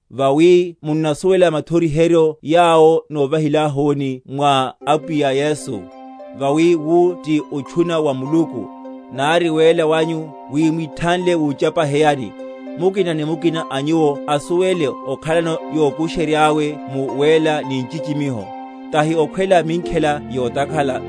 Vawi munnasuwela mathoriheryo yawo nóvahilahuni mwa Apwiya Yesu. Vawi wu ti otchuna wa Muluku, nari wéla wanyu, wi mwithanle wuchapaheyani; mukina ni mukina a nyuwo asuwele okhalano yokusheryáwe mu wéla ni nchichimiho, tahi okhwela minkhela yotakhala,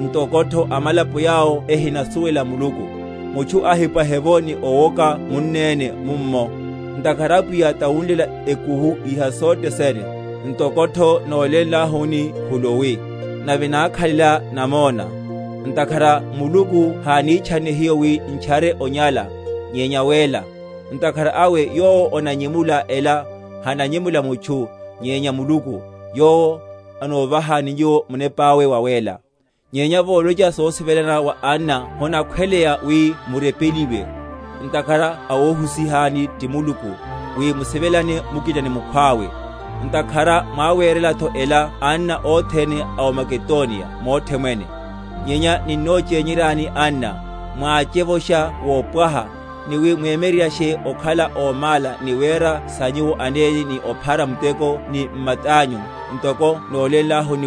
ntokotho amalapo yawo ehinamusuwela Muluku; mutchu ahipwahe’vo, ni owoka munneni mummo, ntakhara Apwiya tawunlela ekuhu iha sothe sene, ntokotho nólénlahuni khuluwi, nave nákhalela namona. Ntakhara Muluku hánitchanne hiyo wi n’tchare onyala, nyenya wéla. Ntakhara awe yowo onanyemula ela, hananyemula mutchu, nyenya Muluku, yowo anovahani nyuwo Munepáwe Wawéla. Nyenya volocha sosivelana wa anna honakhweleya wi murepeliwe; ntakhara awohusihani ti Muluku, wi musivelane mukina ni mukhwawe; ntakhara mwáwerelatho ela anna othene a m’Makedoniya mothe mwene. Nyenya ninnochényeryani, anna, mwáchevosha wopwaha, ni wi mwereryashe okhala ómála ni wera sa nyuwo anene ni ophara muteko ni matányu, ntoko nólénlahuni;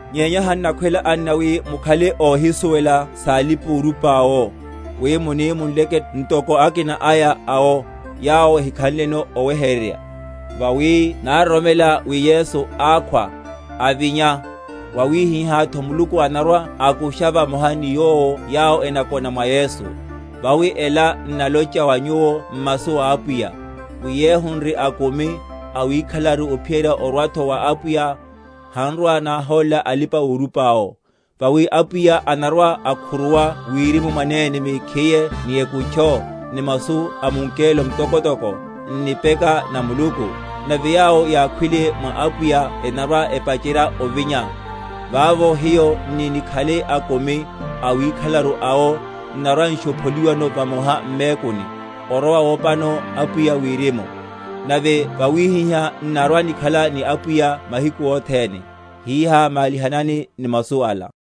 Nyenya hannakhwela, anna, wi mukhale óhisuwela salipaorupa’wo; wi muni munleke ntoko akinako aya awo, yawo ehikhanleno oweheryerya. Vawi naroromela wi Yesu ákhwa, avinya, wawihihátho Muluku anarwa‐akusha vamoha ni Yowo yawo enakona mwa Yesu. Vawi ela n’nalocha wa nyuwo m’masu a Apwiya, wi yehu n’ri akumi, awikhalelaru ophiyerya orwatho wa Apwiya, hanrwa‐náhólela alipa‐orupa’wo. Vawi Apwiya anarwa‐akhuruwa wirimu mwanene mekhiye ni ekutcho, ni masu a mungelo mtokotoko, n’nipeka na Muluku; nave yawo yákhwile mwa Apwiya enarwa‐epacherya ovinya; vavo hiyo n’ni‐nikhale akumi, awikhalelaru awo, n’narwa‐nshopholiwano vamoha m’mekuni, orowa wopano Apwiya wirimu, nave vawihihá n’narwa‐nikhala ni Apwiya mahiku othene. Hiha, malihanani ni masu yala.